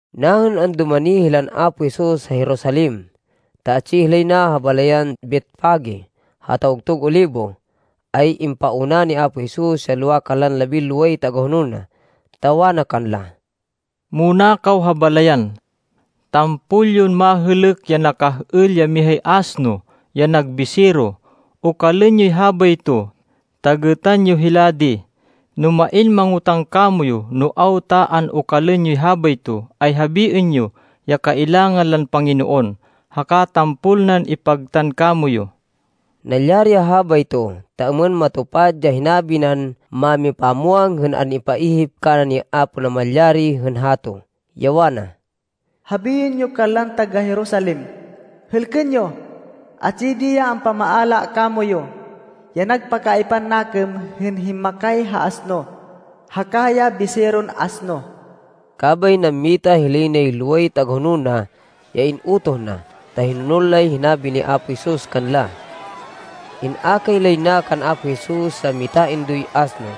Nahên andumani hilan Apo Jesus ha Jerusalem, ta atsi hilay na ha balayan Betfage ha Tawgtug Olibo, ay impauna ni Apo Jesus ya lowa kanlan labinloway tagahonol na, ta wana kanla, “Muna kaw ha balayan. Tampol yon mahêlêk ya nakah-êl ya mihay asno, ya nag bisero. Okalên yoy habayto, ta gêtan yo hila di. No main mangotáng kamoyu no awta an-okalên yoy habayto, ay habiên yo, ya kailangan lan Panginoon, haka tampol nan ipagtan kamoyu.” Nalyari ya habayto, ta êmên matupad ya hinabi nan mámipamwang hên an-ipaihip kana ni Apo Namalyari hên hato, ya wana, “Habiên yo kanlan taga-Jerusalem, ‘Hêlkên yo, atsi di ya ampamaala kamoyu, ya nagpakaaypan nakêm hên himmakay ha asno, haka ya biseron asno.’” Kabay nammita hilay nay loway tagahonol na ya in-utoh na, ta hinonol lay hinabi ni Apo Jesus kanla. In-akay lay na kan Apo Jesus ya mitaindoy asno,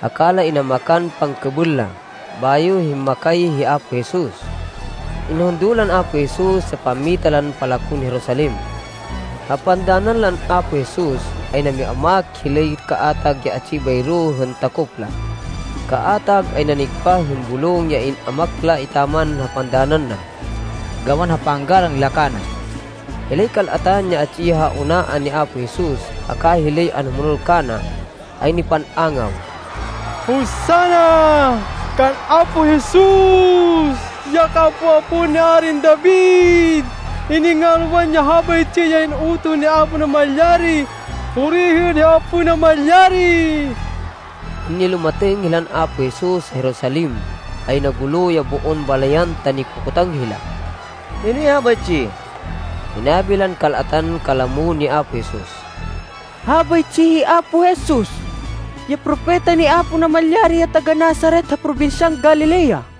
haka la inamakan pangkêbêl la, bayo himmakay hi Apo Jesus. Inhundo lan Apo Jesus ya pammita lan palakon Jerusalem. Ha pandanan lan Apo Jesus, ay nami-amak hilay kaatag ya atsi bayro hên takop la. Kaatag ay nanigpah hên bulong ya in-amak la etaman ha pandanan na, gawan ha panggalang la kana. Hilay kal-atan ya atsi ha unaan ni Apo Jesus haka hilay anhumonol kana ay nipan-angaw, “Hosanna kan Apo Jesus, ya kaapo-apoan ni Arin David! Iningalwan ya habaytsi ya in-utoh ni Apo Namalyari! Puriên hi Apo Namalyari!” Hên nilumatêng hilan Apo Jesus ha Jerusalem, ay nagulo ya boon balayan ta nikokotang hila, “Hinoy habaytsi?” Hinabi lan kal-atan kalamo ni Apo Jesus, “Habaytsi hi Apo Jesus ya propeta ni Apo Namalyari ya taga-Nazaret ha probinsyan Galilea.”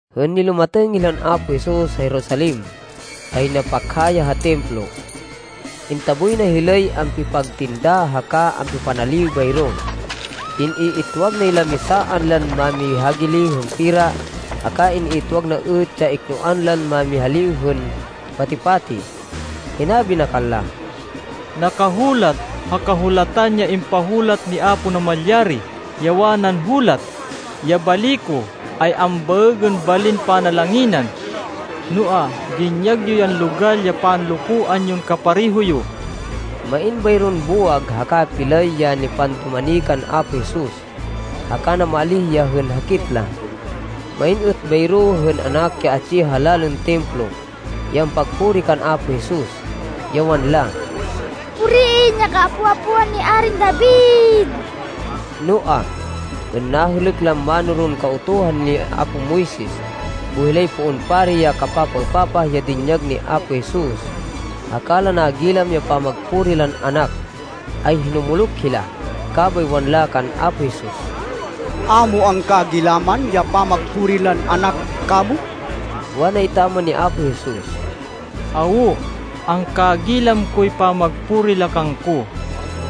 Hên nilumatêng hilan Apo Jesus ha Jerusalem, ay nagpakha ya ha Templo. Intaboy na hilay ampipagtinda haka ampipanaliw bayro. In-iitwag nay lamisaan lan mámihagili hên pera, haka in-iitwag na êt ya iknoan lan mámihaliw hên pati-pati. Hinabi na kanla, “Nakahulat ha Kahulatan ya impahulat ni Apo Namalyari, ya wanan hulat, ‘Ya bali ko ay ambaêgên balin panalanginan.’ Noa, dinyag yo yan logal ya panlokoan yon kapareho yo!” Main bayron buwag haka pilay ya nipandumani kan Apo Jesus, haka namaalíh ya hên hakit la. Main êt bayro hên anak ya atsi ha lalên Templo ya ampagpuri kan Apo Jesus, ya wanla, “Puriên ya Kaapo-apoan ni Arin David!” Noa, hên nahêlêk lan mánoron Kautuhan ni apo Moises boy hilay poon pari ya kapapaêpapah ya dinyag ni Apo Jesus, haka la nagilam ya pamagpuri lan anak, ay hinumuluk hila. Kabay wanla kan Apo Jesus, “A mo angkagilaman ya pamagpuri lan anak kamo?” Wana etaman ni Apo Jesus, “Awo! Angkagilam koy pamagpuri la kangko.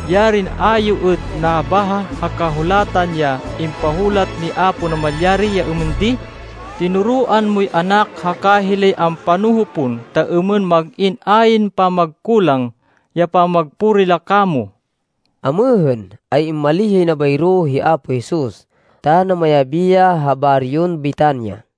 Yarin a yo êt nabaha ha Kahulatan ya impahulat ni Apo Namalyari ya êmên di, ‘Tinoroan moy anak haka hilay ampanoho pon ta êmên mag-in ayn pamagkulang ya pamagpuri la kamo!’” Amêhên, ay immalíh yay na bayro hi Apo Jesus ta namayabi ya ha baryon Betania.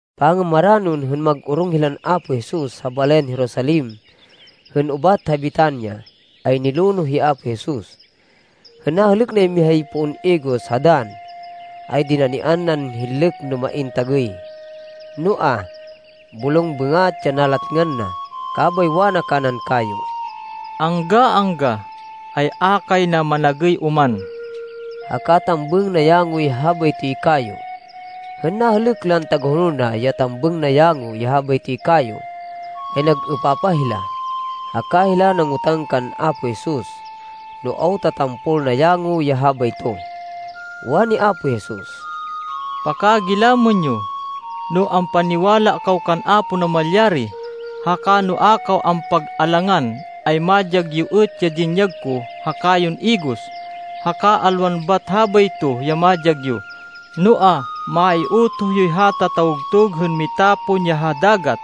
Pangamaranon hên mag-orong hilan Apo Jesus ha balayan Jerusalem hên ubat ha Betania, ay nilonoh hi Apo Jesus. Hên nahêlêk nay mihay poon igos ha dann, ay dinanian nan hinlêk no main tagêy. Noa, bulong bêngat ya nalatngan na. Kabay wana kanan kayo, “Angga-angga, ay a kay na managêy oman!” Haka tambêng nayangoy habaytoy kayo. Hên nahêlêk lan tagahonol na ya tambêng nayango ya habaytoy kayo, ay nag-êpapah hila, haka hila nangotang kan Apo Jesus no awta tampol nayango ya habayto. Wani Apo Jesus, “Pakagilamên yo, no ampaniwala kaw kan Apo Namalyari, haka no a kaw ampag-alangan, ay madyag yo êt ya dinyag ko ha kayon igos, haka alwan bat habayto ya madyag yo, noa, maiutoh yoy hata tawgtug hên mitapon ya ha dagat,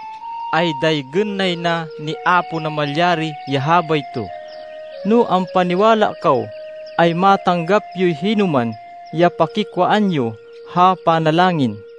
ay daygên nay na ni Apo Namalyari ya habayto. No ampaniwala kaw, ay matanggap yoy hinoman ya pakikwaan yo ha panalangin.”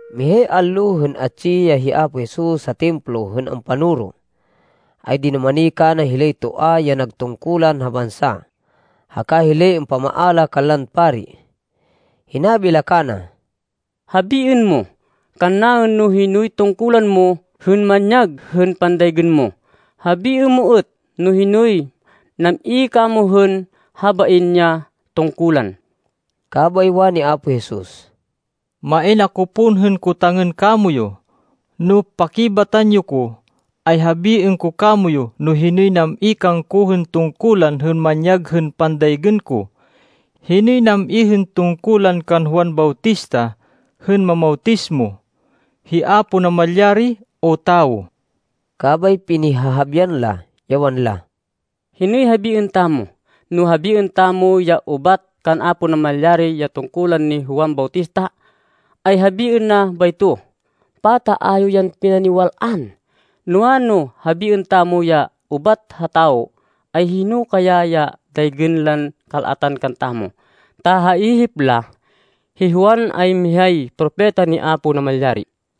Mihay allo hên atsi ya hi Apo Jesus ha Templo hên ampanoro, ay dinumani kana hilay toa ya nag tungkulan ha bansa, haka hilay ampamaala kanlan pari. Hinabi la kana, “Habiên mo kannaên no hinoy tungkulan mo hên manyag hên pandaygên mo. Habiên mo êt no hinoy nam-i kamo hên habain ya tungkulan.” Kabay wani Apo Jesus, “Main ako pon hên kotangên kamoyu. No pakibatan yo ko, ay habiên ko kamoyu no hinoy nam-i kangko hên tungkulan hên manyag hên pandaygên ko. Hinoy nam-i hên tungkulan kan Juan Bautista hên mamawtismo? Hi Apo Namalyari o tawo?” Kabay pinihahabian la, ya wanla, “Hinoy habiên tamo? No habiên tamo ya ‘Ubat kan Apo Namalyari ya tungkulan ni Juan Bautista,’ ay habiên na bayto, ‘Pata a yo yan pinaniwal-an?’ Noa, no habiên tamo ya ‘Ubat ha tawo,’ ay hino kaya ya daygên lan kal-atan kantamo, ta ha ihip la, hi Juan ay mihay propeta, ni Apo Namalyari.”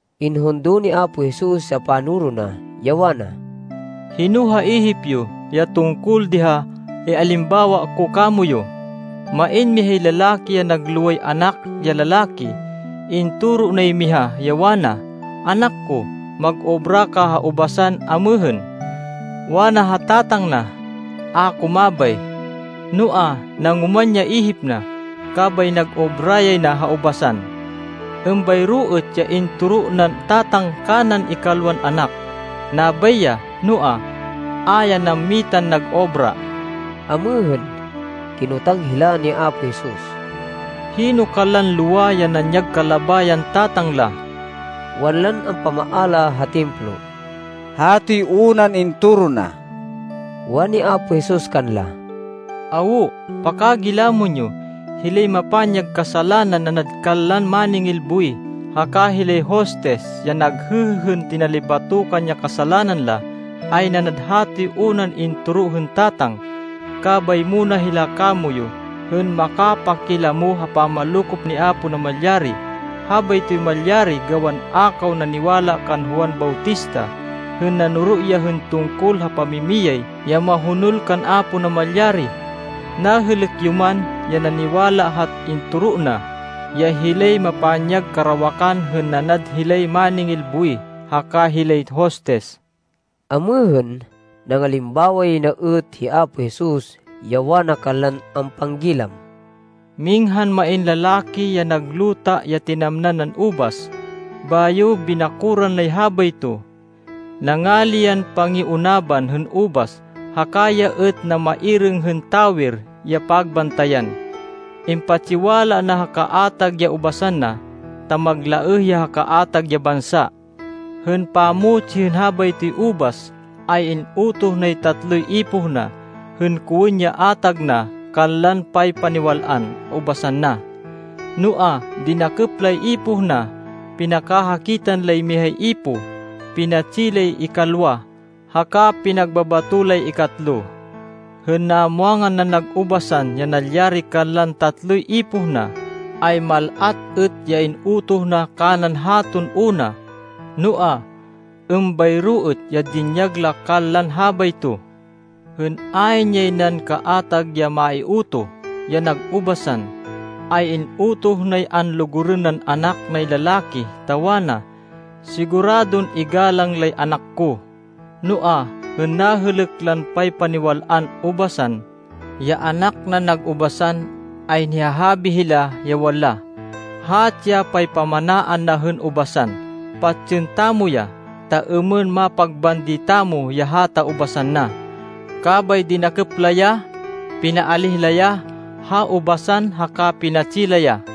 Inhundo ni Apo Jesus ya panoro na, ya wana, “Hino ha ihip yo ya tungkol di ha ialimbawa ko kamoyu? Main mihay lalaki ya nag loway anak ya lalaki. Intoro nay miha, ya wana, ‘Anak ko, mag-obra ka ha ubasan amêhên.’ Wana ha tatang na, ‘A ko mabay.’ Noa, nangoman ya ihip na, kabay nag-obra yay na ha ubasan. Êmbayro êt ya intoro nan tatang kanan ikalwan anak. Nabay ya, noa, a ya nammitan nag-obra.” Amêhên, kinotang hila ni Apo Jesus, “Hino kanlan lowa ya nanyag kalabayan tatang la?” Wanlan ampamaala ha Templo, “Hatoy unan intoro na.” Wani Apo Jesus kanla, “Awo! Pakagilamên yo! Hilay mapanyag kasalanan nanad kanlan máningil buwih haka hilay hostis ya naghêhê hên tinalibatokan ya kasalanan la, ay nanad hatoy unan intoro hên tatang, kabay muna hila kamoyu hên makapakilamo ha pamanlokop ni Apo Namalyari. Habaytoy malyari gawan a kaw naniwala kan Juan Bautista, hên nanoro ya hên tungkol ha pamimiyay ya mahonol kan Apo Namalyari, nahêlêk yo man ya naniwala ha intoro na, ya hilay mapanyag karawakan hên nanad hilay máningil buwih haka hilay hostis.” Amêhên, nangalimbawa yay na êt hi Apo Jesus, ya wana kanlan ampanggilam, “Minghan main lalaki ya nag luta ya tinamnan nan ubas. Bayo binakoran nay habayto. Nangali yan pangiunaban hên ubas, haka ya êt namairêng hên tawer ya pagbantayan. Impatsiwala na ha kaatag ya ubasan na, ta maglaêh ya ha kaatag ya bansa. Hên pamutsi hên habaytoy ubas, ay in-utoh nay tatloy ipoh na, hên kowên ya atag na kanlan paypaniwal-an ubasan na. Noa, dinakêp lay ipoh na. Pinakahakitan lay mihay ipoh, pinatsi lay ikalwa haka pinagbabato lay ikatlo. Hên namwangan nan nag ubasan ya nalyari kanlan tatloy ipoh na, ay mal-at êt ya in-utoh na kanan haton una, noa, êmbayro êt ya dinyag la kanlan habayto. Hên ayn yay nan kaatag ya maiutoh, ya nag ubasan, ay in-utoh nay anlugurên nan anak nay lalaki, ta wana, ‘Siguradon igalang lay anak ko.’ Noa, hên nahêlêk lan paypaniwal-an ubasan, ya anak nan nag ubasan, ay nihahabi hila, ya wanla, ‘Hatsi ya paypamanaan na hên ubasan. Patsên tamo ya, ta êmên mapagbandi tamo ya hata ubasan na.’ Kabay dinakêp la ya, pinaalíh la ya ha ubasan haka pinatsi la ya.”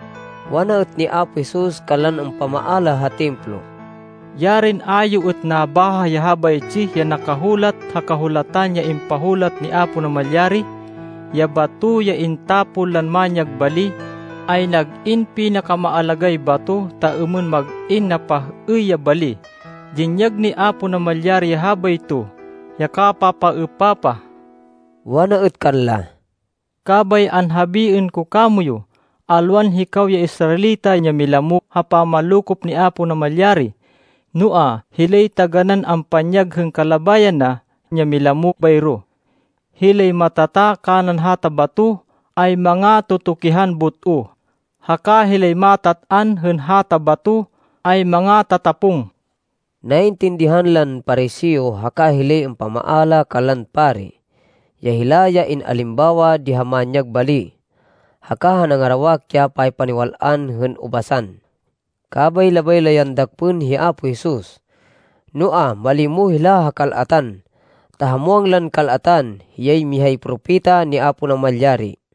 Wana êt ni Apo Jesus kanlan ampamaala ha Templo, “Yarin a yo êt nabaha ya habaytsi ya nakahulat ha Kahulatan ya impahulat ni Apo Namalyari? ‘Ya bato ya intapon lan manyag bali, ay nag-in pinakamaalagáy bato ta êmên mag-in napah-êy ya bali. Dinyag ni Apo Namalyari ya habayto, ya kapapaêpapah.’” Wana êt kanla, “Kabay anhabiên ko kamoyu, alwan hikaw ya Israelita ya milamo ha pamanlokop ni Apo Namalyari, noa hilay taganán ampanyag hên kalabayan na ya milamo bayro. Hilay matata kanan hata bato ay mangatutukihan but-o, haka hilay matat-an hên hata bato ay mangatatapong.” Naintindihan lan Pariseo haka hilay ampamaala kanlan pari, ya hila ya in-alimbawa di ha manyag bali, haka ha nangarawak ya paypaniwal-an hên ubasan. Kabay labay la yan dakpên hi Apo Jesus, noa, malimo hila ha kal-atan ta ha muwang lan kal-atan, hiyay mihay propeta ni Apo Namalyari.